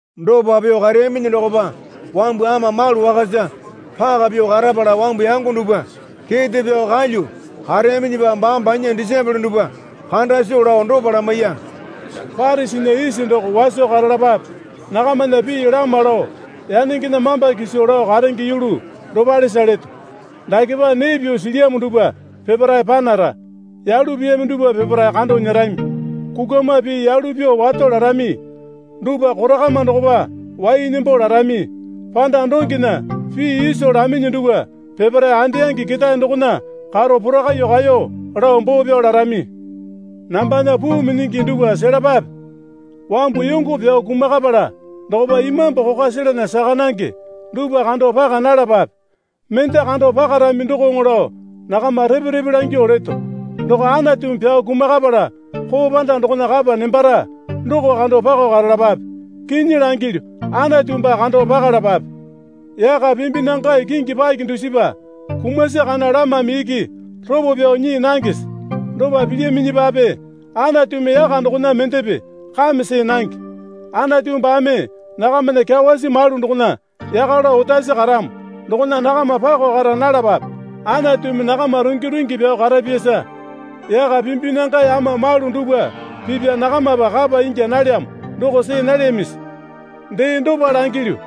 Dopa pyuo kareyaminyi dokopa wambu ama malu wakasa paka pyuo karapala wambu yango dupwa kete pyao kalyuo kareyaminyipa baame banya disaepole dupwa kanda soo lao dopa lamaiya. Parisinya isi doko waso karalapape. Nakamana pii lama lao yanengena mamba kiso lao karenge yulu dopalesa leto. Dakepa nee pyuo silyamo dupwa peparae panara. Yalu piyami dupwa peparae kando nyerami. Kukwama pii yalu pyuo wato larami dupwa korakama dokopa wai nembo larami. Panda dongena pii iso laminyi dupwa peparae andeyangi ketae dokona karo porakaiyuo kaeyo lao boo pyao larami. Nambana puu minyingi dupwa selapape. Wambu yongo pyao kumakapala dokopa imambu kokwa selana saka nange dupwa kando paka nalapape. Mende kando pakarami dokoŋo lao nakama repe repe langyuo leto. Doko Anatumi pyao kumakapala koo panda dokona kapa nembara doko kando pako karalapape. Kinyi langilyu, Anatu baa kando pakalapape. Yaka pimbinangae kingi paki dusipa kumasi kana lamame iki ropo pyao nyii nangese? Dopa pilyaminyipape Anatumi yaka dokona mendepe kame see nange. Anatu baame nakamana kyawasi malu dokona yaka lao otasi karamo dokona nakama pako kara nalapape. Anatumi nakama rungi rungi pyao karapyasa yaka pimbinangae ama malu dupwa pipa nakamapa kapa ingya nalyamo doko see nalyamisi? Dee dopa langilyu,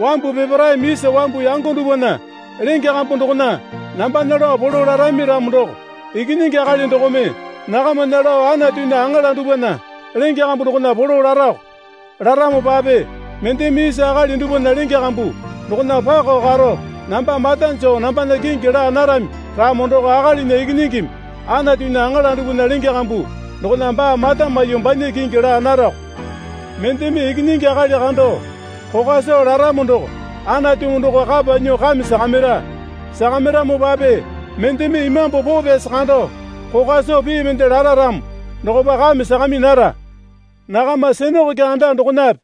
wambu peparaeme isa wambu yango dupwana lenge kambu dokona nambana lao polo larami ramo doko Ikinyingi Akali dokome nakamana lao Anatunya aŋala dupwana lenge kambu dokona polo larako. Laramopape mendeme isa akali dupwana lenge kambu dokona pako karo namba mata joo nambana kingi laa narami ramo doko Akalinya Ikinyingimi Anatunya aŋala dupwana lenge kambu dokona baa mata maiyuo banya kingi laa narako. Mendeme Ikinyingi Akali kando kokwa soo laramo doko Anatumi doko kapa nyuo kame sakamira. Sakamiramopape mendeme Imambu Poo Pyasi kando kokwa soo pii mende lara ramo dokopa kame sakami nara. Nakama sinakoke anda dokonape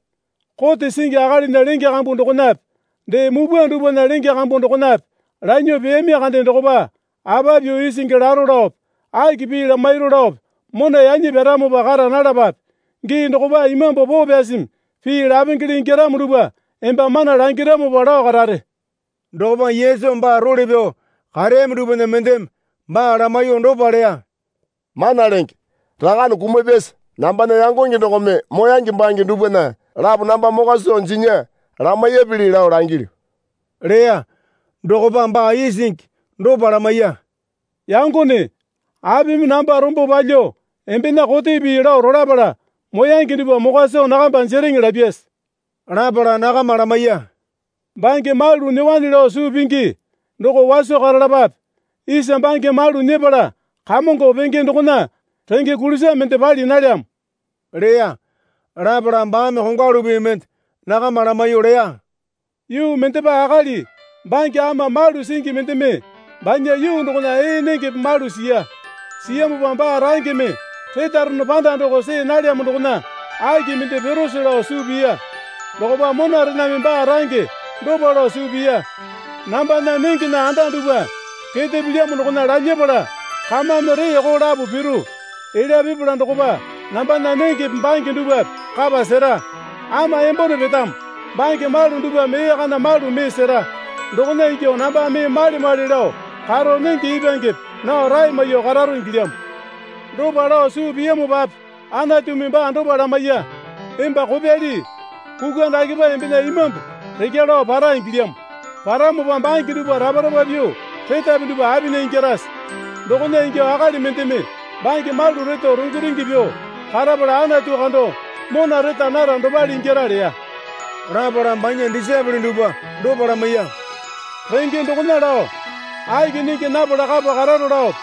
kote singi akalinya lenge kambu dokonape dee mupwa dupwana lenge kambu dokonape lanyuo peyami kande dokopa apa pyuo isingi laro laope aki pii lamairo laope mona yanyi pyaramopa kara nalapape. Gii dokopa Imambu Poo Pyasimi pii lapengele ingyaramo dupwa emba mana langiramopa lao karare. Dokopa Yesu baa role pyao kareyami dupwana mendeme baa lamaiyuo dopa leya. Mana lenge rakane kumapyasa nambana yangonge dokome moyange bange dupwana lapo namba mokwa soo jinya lamaiyapili lao langilyu leya. Dokopa baa isingi dopa lamaiya. Yangone, apimi namba rombo palyuo embena kote pii lao rolapala moyange dupwa mokwa soo nakamba jereŋe lapyase? Lapala nakama lamaiya. Bange malu nyuowane lao suu pingi, doko waso karalapape. Isa bange malu nyepala kamongo penge dokona renge kulisa mende pali nalyamo leya. Lapala baame kongwalu pii mende nakama lamaiyuo leya. Yuu mendepa akali bange ama malu singi mendeme banya yuu dokona ee nengepe malu siya. Siyamopa baa rangeme retarono panda doko see nalyamo dokona aki mende pirose lao suu piya. Dokopa monarename baa range dopa lao suu piya. Nambana nengena anda dupwa kete pilyamo dokona lalyapala kamame reeko lapo piru. Elya pipala dokopa nambana nengepe bange dupwape kapa sera. Ama embone petamo. Bange malu dupwame ee kana malu mee sera. Dokona ingyuo namba mee male male lao karo nenge ipwangepe nao rae maiyuo kararo ingilyamo. Dopa lao suu piyamopape Anatumi baa dopa lamaiya. Emba kopyali, kukwa dakepa embena imambu rekya lao para ingilyamo. Paramopa bange dupwa rapa rapa pyuo retapi dupwa apinya ingyarase? Dokona ingyuo akali mendeme bange malu reto rungi rungi pyuo karapala Anatu kando mona reta nara dopale ingyara leya. Lapala banya disaepole dupwa dopa lamaiya. Renge dokona lao, aki nenge napala kapa kararo laope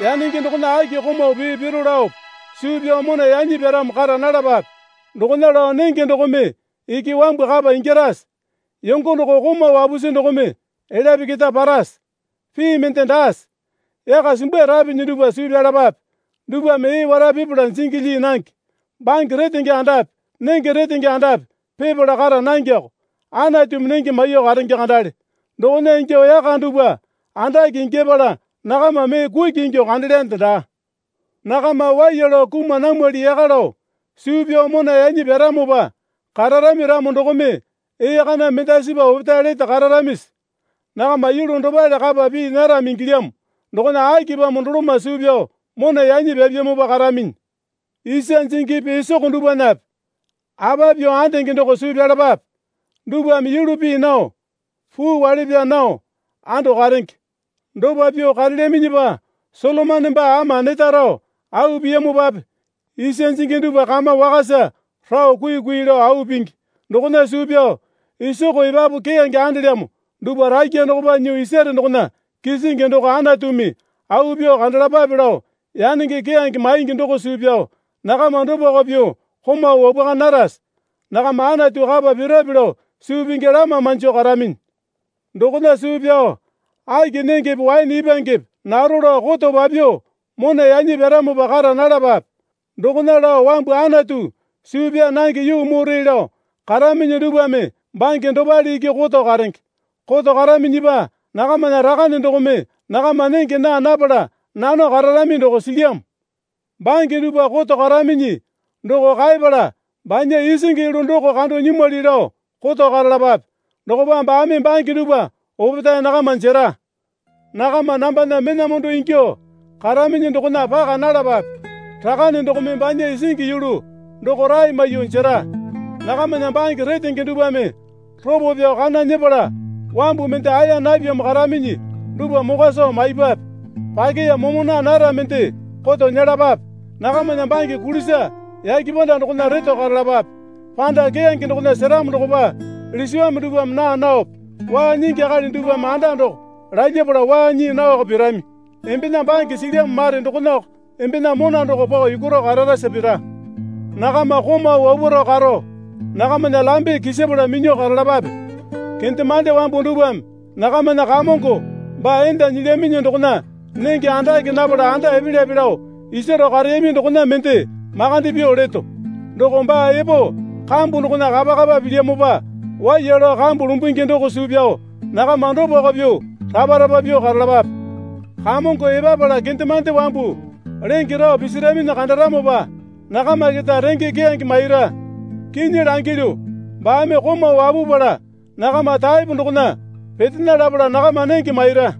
yanenge dokona aki komau pee piro laope suu pyao mona yanyi pyaramo kara nalapape. Dokona lao nenge dokome iki wambu kapa ingyarase? Yongo doko komau wapusi dokome elyape keta parase? Pii mende daase? Yaka simbairapinyi dupwa suu pyalapape. Dupwame ee wara pipala jingi lyii nange, bange retenge andape nenge retenge andape pipala kara nangeko. Anatumi nenge maiyuo karenge kandale. Dokona ingyuo yaka dupwa andake ingyapala nakama mee kuki ingyuo kandelyande daa. Nakama waiya lao kuma namwali yaka lao suu pyao mona yanyi pyaramopa kararami ramo dokome ee kana mendasipa opetae lete kararamisi? Nakama yulu dopale kapa pii narami ingilyamo dokona akipamo doloma suu pyao mona yanyi pyapyamopa karaminyi? Isa jingipi isoko dupwanape apa pyuo andenge doko suu pyalapape. Dupwame yulu pii nao, puu wale pyaa nao ando karenge. Dopa pyuo karelyaminyipa Solomone baa ama neta rao au piyamopape isa jingi dupwa kama wakasa rao kuikui lao au pingi. Dokona suu pyao isoko epapu keyange andelyamo dupwa rakya dokopa nyuo isare dokona kisingi doko Anatumi au pyuo kandalapape lao yanenge keyange maingi doko suu pyao nakama dopako pyuo komau wapwaka narase? Nakama Anatu kapa pirape lao suu pingi lama manjo karaminyi. Dokona suu pyao aki nengepe waene ipwangepe naro lao koto papyuo mona yanyi pyaramopa kara nalapape. (Dokona lao wambu Anatu suu pyaa nange yuu mure lao karaminyi dupwame bange dopale iki koto karenge.) Koto karaminyipa nakamana Rakane dokome nakama nenge naa napala nano kararami doko silyamo. Bange dupwa koto karaminyi doko kaepala banya isingi yulu doko kando nyimwali lao koto karalapape. Dokopa baame bange dupwa opetae nakama jera. Nakama nambana mena mondo ingyuo karaminyi dokona paka nalapape. Rakane dokome banya isingi yulu doko rae maiyuo jera. Nakamana bange retenge dupwame ropo pyao kana nyepala wambu mende aeya napyamo karaminyi dupwa mokwa soo maipwape. Pakeya momo naa nara mende koto nyelapape. Nakamana bange kulisa yake panda dokona reto karalapape. Panda keyange dokona seramo dokopa lisiwame dupwame naa naope waa nyingi akali dupwame anda doko lalyapala waa nyii naoko pirami. Embena bange silyamo mare dokonako embena mona doko pao yukwaro kararasa pira. Nakama komau wapwaro karo nakamana lambe kisapala minyuo karalapape. Kendemande wambu dupwame nakamana kamongo baa enda nyilyaminyi dokona nenge andake napala anda epelyape lao isaro kareyami dokona mende makande pyuo leto. Doko baa epo kambu dokona kapa kapa pilyamopa waiya lao kambu lumbungi doko suu pyao nakama dopako pyuo rapa rapa pyuo karalapape. Kamongo epapala kendemande wambu lenge rao pisiraminyi kandaramopa nakama keta renge keyange maira. Kinyi langilyu, baame komau wapupala nakama taepo dokona petena lapala nakama nenge maira.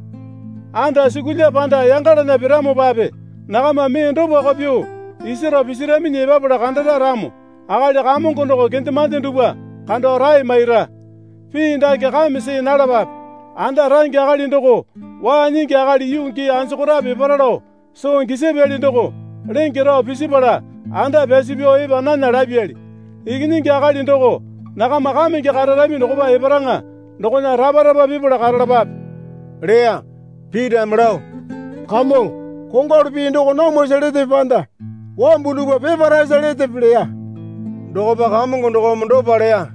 Andasukulya panda yangalana piramopape nakama mee dopako pyuo isaro pisiraminyi epapala kandara ramo akali kamongo doko kendemande dupwa kando rae maira. Pii dake kame see nalapape. Anda range akali doko waa nyingi akali yuu gii anjokorape epara lao soo gisapyali doko lenge rao pisipala anda pyasu pyao epa nana lapyali. Ikinyingi Akali doko nakama kamenge kararami dokopa eparaŋa dokona rapa rapa pipala karalapape leya. Pitame lao, Kamongo, kongwalu pii doko namwasa letepe panda wambu dupwa peparaesa letepe? leya. Dokopa Kamongo dokome dopa leya.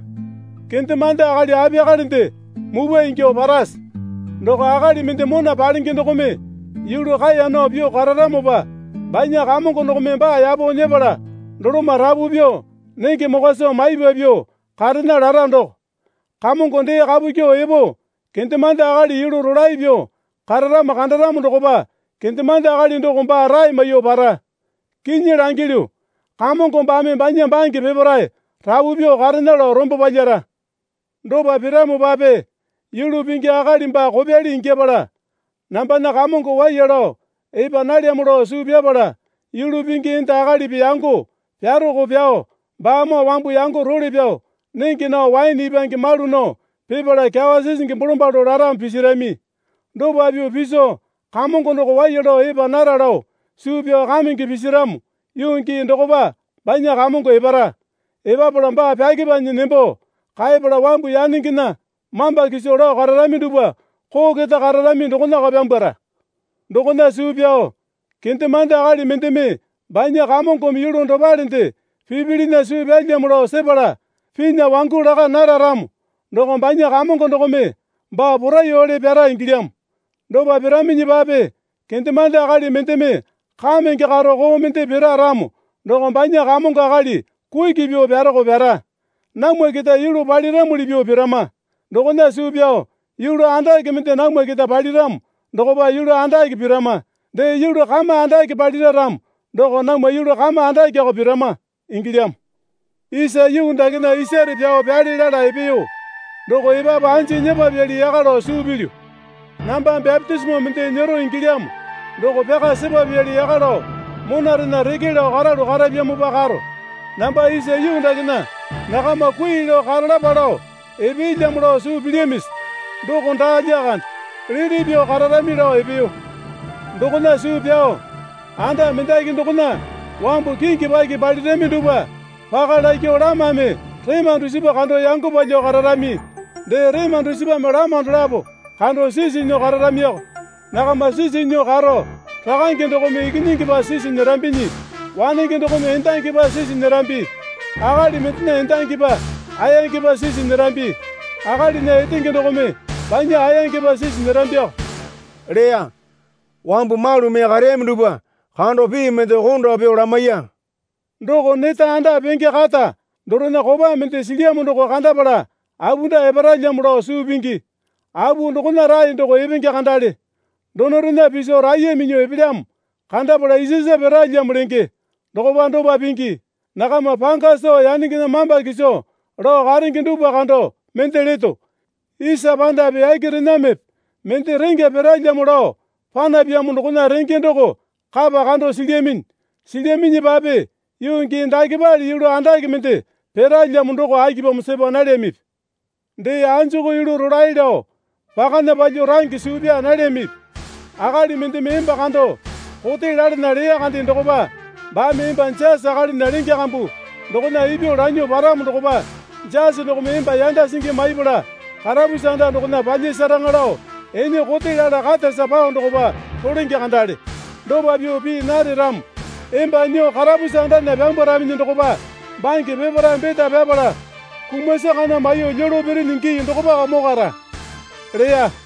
Kendemande akali apiyakalende mupwa ingyuo parase? Doko akali mende mona palenge dokome yulu kaeya nao pyuo kararamopa banya kamongo dokome baa yapo nyepala doloma rapu pyuo nenge mokwa soo maipa pyuo karena lara doko. Kamongo dee kapu kyuo epo kendemande akali yulu rolae pyuo kararamo kandaramo dokopa kendemande akali doko baa rae maiyuo para. Kinyi langilyu, kamongo baame banya bange peparae rapu pyuo karena lao rombo palyara. Dopa piramopape yulu pingi akali baa kopyali ingyapala, Nambana kamongo waiya lao epa nalyamo lao suu pyapala yulu pingi enda akalipi yango pyarako pyao baamoo wambu yango role pyao nenge nao waene ipwange malu nao pipala kyawa sisingi bolombalo laramo pisirami. Dopa pyuo piso kamongo doko waiya lao epa nara lao suu pyao kamenge pisiramo yuu gii dokopa banya kamongo epara. Epapala baa pyakepanyi nembo kaepala wambu yanengena mamba kiso lao kararami dupwa koo keta kararami dokonako pyambwara. Dokona suu pyao kendemande akali mendeme banya kamongome yulu dopalende pipilinya suu pyalyamo lao sepala pinya wangu laka nara ramo doko banya kamongo dokome baa poraiyuowale pyara ingilyamo. Dopa piraminyipape kendemande akali mendeme kamenge karo koo mende pira ramo doko banya kamongo akali kuki pyuo pyaroko pyara. Namwa keta yulu paliramuli pyuo pirama. Dokona suu pyao yulu andake mende namwa kete paliramo dokopa yulu andake pirama. Dee yulu kama andake palira ramo doko namwa yulu kama andakeoko pirama ingilyamo. Isa yuu dakena isare pyao pyale lala epeyo doko epapu anji nyepapyali yaka lao suu pilyu. Namba bapitisimo mende nyero ingilyamo doko pyaka sepapyali yaka lao monarena reke lao karalu karapyamopa karo. Namba isa yuu dakena nakama kui lao karalapa lao epelyamo lao suu pilyamisi? Doko daa lyakande. Liti pyuo kararami lao epeyo. Dokona suu pyao anda mendaki dokona wambu kingi paki palirami dupwa paka lakyuo lamame rema dusipa kando yango palyuo kararami. Dee rema dusipame lama dolapo kando sisi nyuo kararamioko. Nakama sisi nyuo karo rakange dokome ikinyingipa sisi nyerambinyi, wanenge dokome endangipa sisi nyerambi. Akali mendena endangipa ayangepa sisi nyerambi, akalinya etenge dokome banya ayangepa sisi nyerambioko leya. Wambu malu mee kareyami dupwa kando pii mende konda pyuo lamaiya. Doko neta anda penge kata dorena kopa mende silyamo doko kandapala apunda eparalyamo lao suu pingi. Apu dokona rae doko epenge kandale. Donorena piso raiya minyuo epelyamo kandapala isasa piralyamo lenge. Dokopa dopa pingi. Nakama panga soo yanengena mamba kiso lao karenge dupwa kando mende leto. Isa pandape yakerenamepe mende rengya piralyamo lao panapyamo dokona renge doko kapa kando silyaminyi. Silyaminyipape yuu gii dakepale yulu andake mende piralyamo doko akipamo sepa nalyamipi? Dee, anjuku yulu rolae lao pakana palyuo range suu pyaa nalyamipi? Akali mendeme emba kando kote lalana leya kande dokopa baame emba jasi akalinya lenge kambu dokona ipyuo lanyuo paramo dokopa jasi dokome emba yanda singi maipala karapusi anda dokona palyasaraŋa lao ene kote lala katasa pao dokopa rolenge kandale. Dopa pyuo pii nare ramo emba nyuo karapusi andana pyambwaraminyi dokopa bange peparae beta pyapala kumasi kana maiyuo lyolo pirinyi gii dokopako mokwara leya.